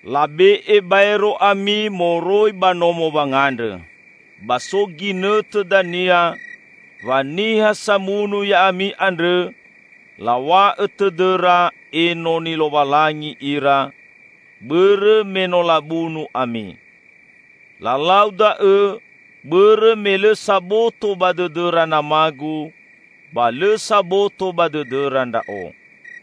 Labe'e baero ami moroi ba nomo wangandrõ. Ba so ginõtõ dania wa niha samunu ya'ami andrõ law̃a'õ tõdõra enoni Lowalangi ira, bõrõ me no labunu ami. Lalau da'õ bõrõ me lõ saboto ba dõdõra Nama-Gu ba lõ saboto ba dõdõra Ndra'o.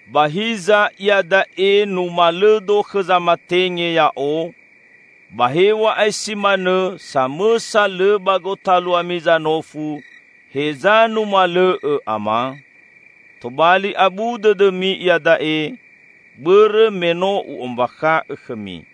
Ba hiza iada'e numalõ-Do khõ zamatenge Ya'o; ba hew̃a'ae si manõ samõsa lõ ba gotaluami zanofu heza numalõ'õ Ama? Tobali abu dõdõmi iada'e, bõrõ me no U'ombakha'õ khõmi.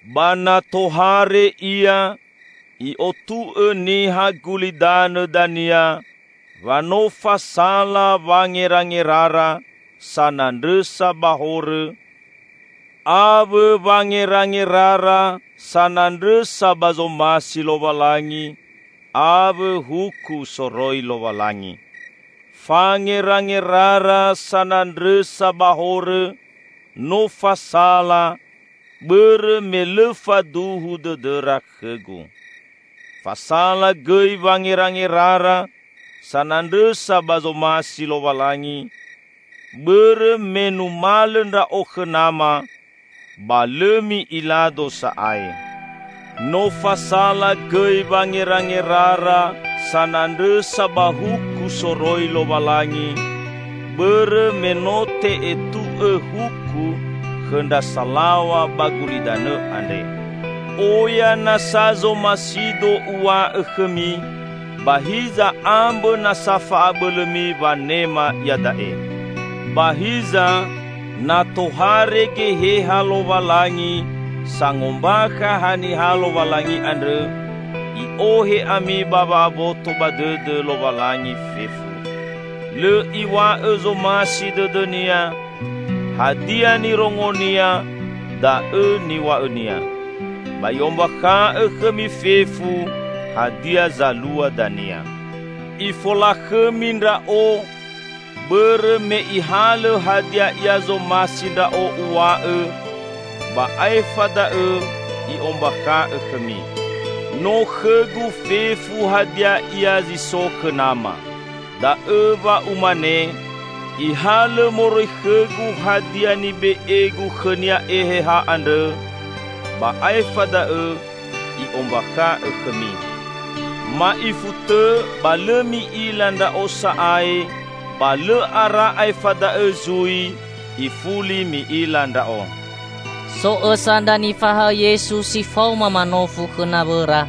Ba na tohare Ia, I'otu'õ niha gulidanõ dania wa no fasala wangerangerara sanandrõsa ba horõ; awõ wangerangerara sanandrõsa ba zomasi Lowalangi, awõ huku soroi Lowalangi. Fangerangerara sanandrõsa ba horõ no fasala bõrõ me lõ faduhu dõdõra khõ-Gu. Fasala gõi wangerangerara sanandrõsa ba zomasi Lowalangi, bõrõ me numalõ Ndra'o khõ Nama ba lõ mi'ila-Do sa'ae. No fasala gõi wangerangerara sanandrõsa ba huku soroi Lowalangi bõrõ me no te'etu'õ huku khõ ndra salaw̃a ba gulidanõ andre! Oya nasa zomasi-Do Uw̃a'õ khõmi, ba hiza ambõ nasa fa'abõlõmi wanema iada'e. Ba hiza, na tohare Geheha Lowalangi sangombakha haniha Lowalangi andrõ, I'ohe ami ba wa'aboto ba dõdõ Lowalangi fefu. Lõ Iw̃a'õ zomasi dõdõ-Nia; hadia nirongo-Nia da'õ niw̃a'õ-Nia. Ba I'ombakha'õ khõmi fefu hadia zalua dania. Ifolakhõmi Ndra'o, bõrõ me Ihalõ hadia ia zomasi Ndra'o Uw̃a'õ, ba aefa da'õ I'ombakha'õ khõmi. No khõ-Gu fefu hadia ia zi so khõ Nama. Da'õ wa Umane, Ihalõ moroi khõ-Gu hadia nibe'e-Gu khõnia Eheha andrõ, ba aefa da'õ I'ombakha'õ khõmi." "Ma'ifu tõ ba lõ mi'ila Ndra'o sa'ae, ba lõ ara aefa da'õ zui ifuli mi'ila Ndra'o." So õsa ndra nifahaõ Yesu si faoma manofu khõ nawõra,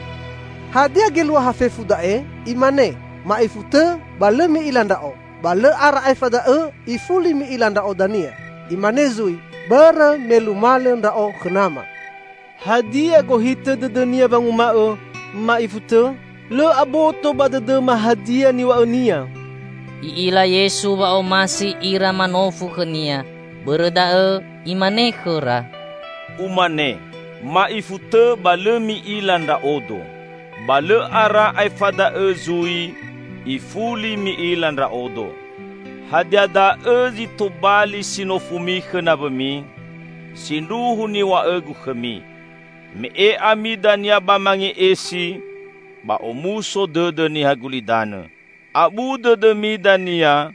"Hadia geluaha fefu da'e? Imane: 'Ma'ifu tõ ba lõ mi'ila Ndra'o, ba lõ ara aefa da'õ ifuli mi'ila Ndra'o dania.' Imane zui: 'Bõrõ me numalõ Ndra'o khõ Nama.'" Hadia gohitõ dõdõ-Nia wanguma'õ, "Ma'ifu tõ? Lõ aboto ba dõdõma hadia niw̃a'õ-Nia!" I'ila Yesu wa omasi ira manofu khõ-Nia. Bõrõ da'õ Imane khõra, "Umane, ma'ifu tõ ba lõ mi'ila Ndra'odo, 'Ba lõ ara aefa da'õ zui ifuli mi'ila Ndra'odo.' Hadia da'õ zi tobali si nofumi khõ nawõmi? Sindruhu niw̃a'õ-Gu khõmi: me'e ami dania ba mange'esi; ba omuso dõdõ niha gulidanõ. Abu dõdõmi dania,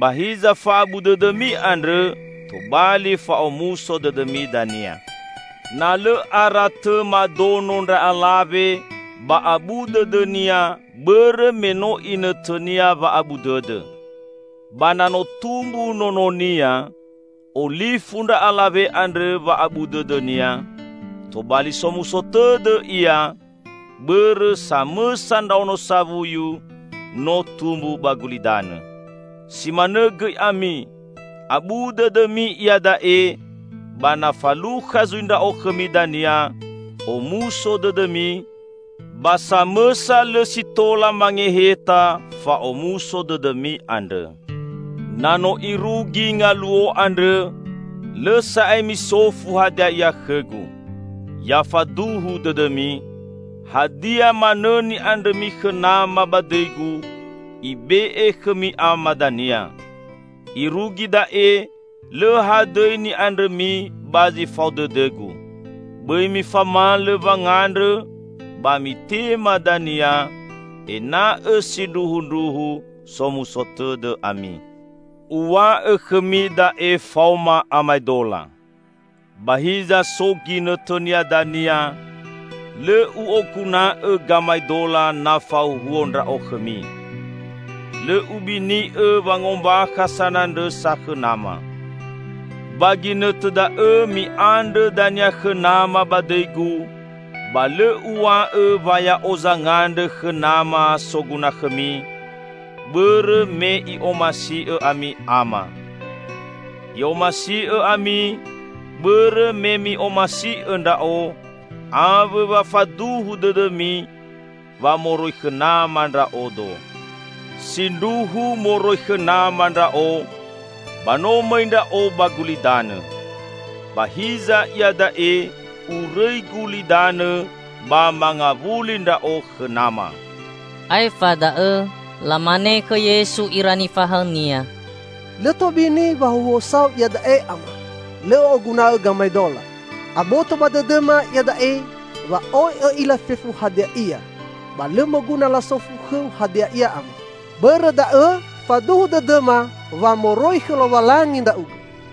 ba hiza fa'abu dõdõmi andrõ tobali fa'omuso dõdõ dania. Na lõ ara tõ madono ndra alawe, ba abu dõdõnia, bõrõ me no inõtõnia wa'abu dõdõ. Ba na no tumbu nononia, olifu ndra alawe andrõ wa'abu dõdõnia; tobali somuso tõdõ ia, bõrõ samõsa ndraono sawuyu no tumbu ba gulidanõ. Si manõ gõi ami: abu dõdõmi iada'e, ba na falukha zui Ndra'o khõmi dania, omuso dõdõmi; ba samõsa lõ si tola mangeheta fa'omuso dõdõmi andrõ. Na no irugi ngaluo andrõ, lõ sa'ae misofu hadia ia khõ-Gu. Ya faduhu dõdõmi: Hadia manõ ni'andrõmi khõ Nama ba dõi-Gu, ibe'e khõmi Ama dania. Irugi da'e lõ hadõi ni'andrõmi ba zi fao dõdõ-Gu. Bõi mifamalõ wangandrõ, ba mitema dania, ena'õ sindruhundruhu somuso tõdõ ami." "Uw̃a'õ khõmi da'e faoma amaedola. Ba hiza so ginõtõnia dania, lõ U'oguna'õ gamaedola na fahuhuo Ndra'o khõmi. Lõ Ubini'õ wangombakha sanandrõsa khõ Nama. Ba ginõtõ da'õ mi'andrõ dania khõ Nama ba dõi-Gu; ba lõ Uw̃a'õ wa Ya'o zangandrõ khõ Nama soguna khõmi, bõrõ me I'omasi'õ ami Ama. I'omasi'õ ami bõrõ me mi'omasi'õ Ndra'o, awõ wa faduhu dõdõmi wa moroi khõ Nama Ndra'odo. Sindruhu moroi khõ Nama Ndra'o, ba no mõi Ndra'o ba gulidanõ. Ba hiza iada'e Urõi gulidanõ ba mangawuli Ndra'o khõ Nama." Aefa da'õ lamane khõ Yesu ira nifahaõ-Nia, "Lõ tobini wahuhuosa-U iada'e, Ama; lõ Õ'oguna'õ gamaedola. Aboto ba dõdõma iada'e wa oi Õ'ila fefu hadia ia; ba lõ moguna lasofu khõ-U hadia ia Ama. Bõrõ da'õ faduhu dõdõma wa moroi khõ Lowalangi Ndra'ugõ."